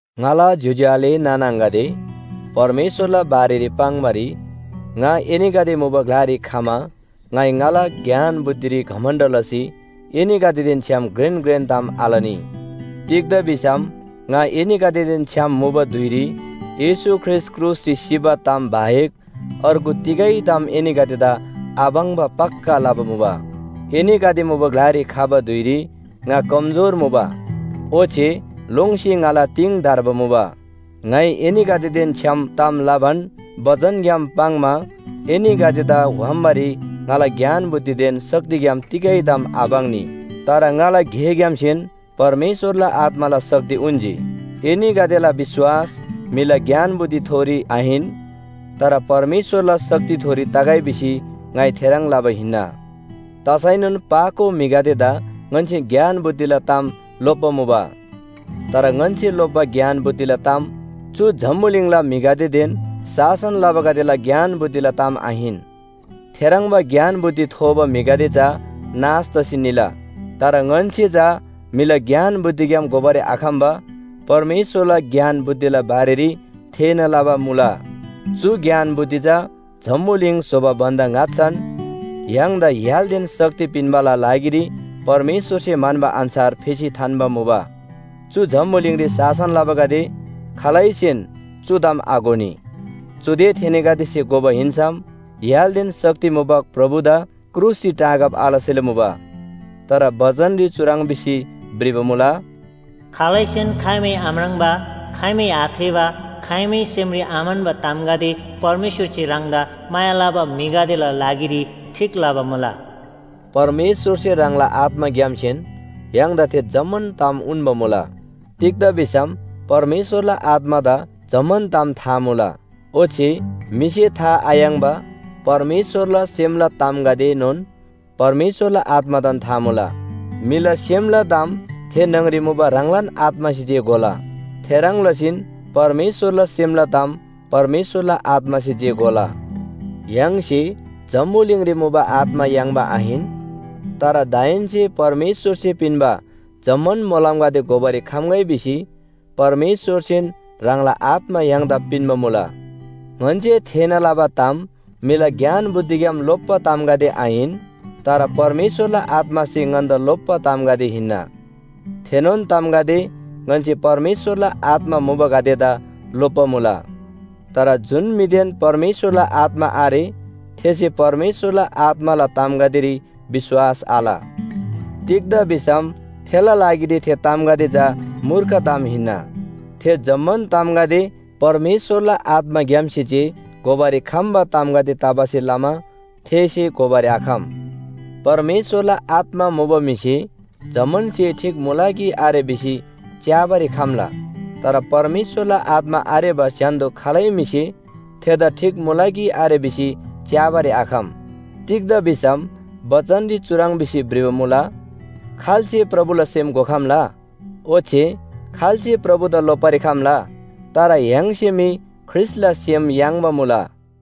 ङाला ज्‍योज्‍यो आले नाना आङागदे, परमेश्‍वरला बारेरी पाङ्‌बारी ङा एनीगदे मुबा ग्‍लारी खमा ङाइ ङाला ज्ञान बुद्धिरी घमण्‍ड लसी एनीगदेदेन छ्‌याम घ्रेन घ्रेन ताम आलनी। तिग्‍दा भिसम ङा एनीगदेदेन छ्‌याम मुबा धुइरी येशू ख्रीष्‍ट क्रुसरी सिबा ताम बाहेक अर्गु तिगै ताम एनीगदेदा आपाङ्बा पक्‍का लबा मुबा। एनीगदे मुबा ग्‍लारी खबा धुइरी ङा कमजोर मुबा, ओच्‍छे लोङ्सी ङाला तिङ धर्बा मुबा। ङाइ एनीगदेदेन छ्‌याम ताम लबान बचनग्‍याम पाङ्‌मा एनीगदेदा व्‍हाम्‍बारी ङाला ज्ञान बुद्धिदेन शक्तिग्‍याम तिगै ताम आपाङ्नी, तर ङाला गेग्‍यामसेन परमेश्‍वरला आत्‍माला शक्ति उन्‍जी। एनीगदेला विश्‍वास म्‍हिला ज्ञान बुद्धिथोरी आहिन, तर परमेश्‍वरला शक्तिथोरी तगै भिसी ङाइ थेह्रङ् लबा हिन्‍ना। तसैनोन पाको म्‍हिगदेदा ङन्‍से ज्ञान बुद्धिला ताम लोप्‍बा मुला। तर ङन्‍से लोप्‍बा ज्ञान बुद्धिला ताम चु जम्‍बुलिङला म्‍हिगदेदेन शासन लबागदेला ज्ञान बुद्धिला ताम आहिन। थेह्रङ्बा ज्ञान बुद्धि थोबा म्‍हिगदे चा नाश तसी निला। तर ङन्‍से चा म्‍हिला ज्ञान बुद्धिग्‍याम घोबारी आखम्‍बा परमेश्‍वरला ज्ञान बुद्धिला बारेरी थेःना लबा मुला। चु ज्ञान बुद्धि चा जम्‍बुलिङ स्‍होबा भन्‍दा ङाच्‍छान य्‍हाङदा य्‍हालदेन शक्ति पिन्‍बाला लागिरी परमेश्‍वरसे म्‍हन्‍बा अन्‍छार फेसी थान्‍बा मुबा। चु जम्‍बुलिङरी शासन लबागदे खालैसेन चु ताम आघोनी। चुदे थेनीगदेसे घोबा हिन्‍सम य्‍हालदेन शक्ति मुबा प्रभुदा क्रुसरी टाँगब आलसेला मुबा। तर बचनरी चुह्रङ् भिसी भ्रिबा मुला, “खालैसेन खाइमै आम्राङ्बा, खाइमै आथेःबा, खाइमै सेमरी आम्‍हन्‍बा तामगदे परमेश्‍वरसे ह्राङदा माया लबा म्‍हिगदेला लागिरी ठीक लबा मुला।” परमेश्‍वरसे ह्राङला आत्‍माग्‍यामसेन य्‍हाङदा थे जम्‍मान ताम उन्‍बा मुला। तिग्‍दा भिसम परमेश्‍वरला आत्‍मादा जम्‍मान ताम था मुला। ओच्‍छे म्‍हिसे था आयाङ्‍बा परमेश्‍वरला सेमला तामगदेएनोन परमेश्‍वरला आत्‍मादान था मुला। म्‍हिला सेमला ताम थे न्‍हङरी मुबा ह्राङलान आत्‍मासे जे घोला, थेह्रङ् लसीन परमेश्‍वरला सेमला ताम परमेश्‍वरला आत्‍मासे जे घोला। य्‍हाङसे जम्‍बुलिङरी मुबा आत्‍मा याङ्बा आहिन, तर दाहेन्‍से परमेश्‍वरसे पिन्‍बा जम्‍मान मोलमगदे घोबारी खम्‍गै भिसी परमेश्‍वरसेन ह्राङला आत्‍मा य्‍हाङदा पिन्‍बा मुला। ङन्‍से थेःना लबा ताम म्‍हिला ज्ञान बुद्धिग्‍याम लोप्‍बा तामगदे आहिन, तर परमेश्‍वरला आत्‍मासे ङन्‍दा लोप्‍बा तामगदे हिन्‍ना। थेनोन तामगदे ङन्‍से परमेश्‍वरला आत्‍मा मुबागदेदा लोप्‍बा मुला। तर जुन म्‍हिदेन परमेश्‍वरला आत्‍मा आरे थेसे परमेश्‍वरला आत्‍माला तामगदेरी विश्‍वास आल। तिग्‍दा भिसम थेला लागिरी थे तामगदे चा मूर्ख ताम हिन्‍ना। थे जम्‍मान तामगदे परमेश्‍वरला आत्‍माग्‍यामसे जे घोबारी खम्‍बा तामगदे तबासे लमा थेसे घोबारी आखम। परमेश्‍वरला आत्‍मा मुबा म्‍हिसे जम्‍मान स्‍हे ठीक मुला कि आरे भिसी च्‍याबारी खम्‍ला। तर परमेश्‍वरला आत्‍मा आरेबा स्‍य्‍हान्‍दो खालै म्‍हिसे थेदा ठीक मुला कि आरे भिसी च्‍याबारी आखम। तिग्‍दा भिसम बचनरी चुह्रङ् भिसी भ्रिबा मुला, “खाल्‍से प्रभुला सेम घोखम्‍ला? ओच्‍छे खाल्‍से प्रभुदा लोप्‍बारी खम्‍ला?” तर य्‍हाङसे मी ख्रीष्‍टला सेम याङ्बा मुला।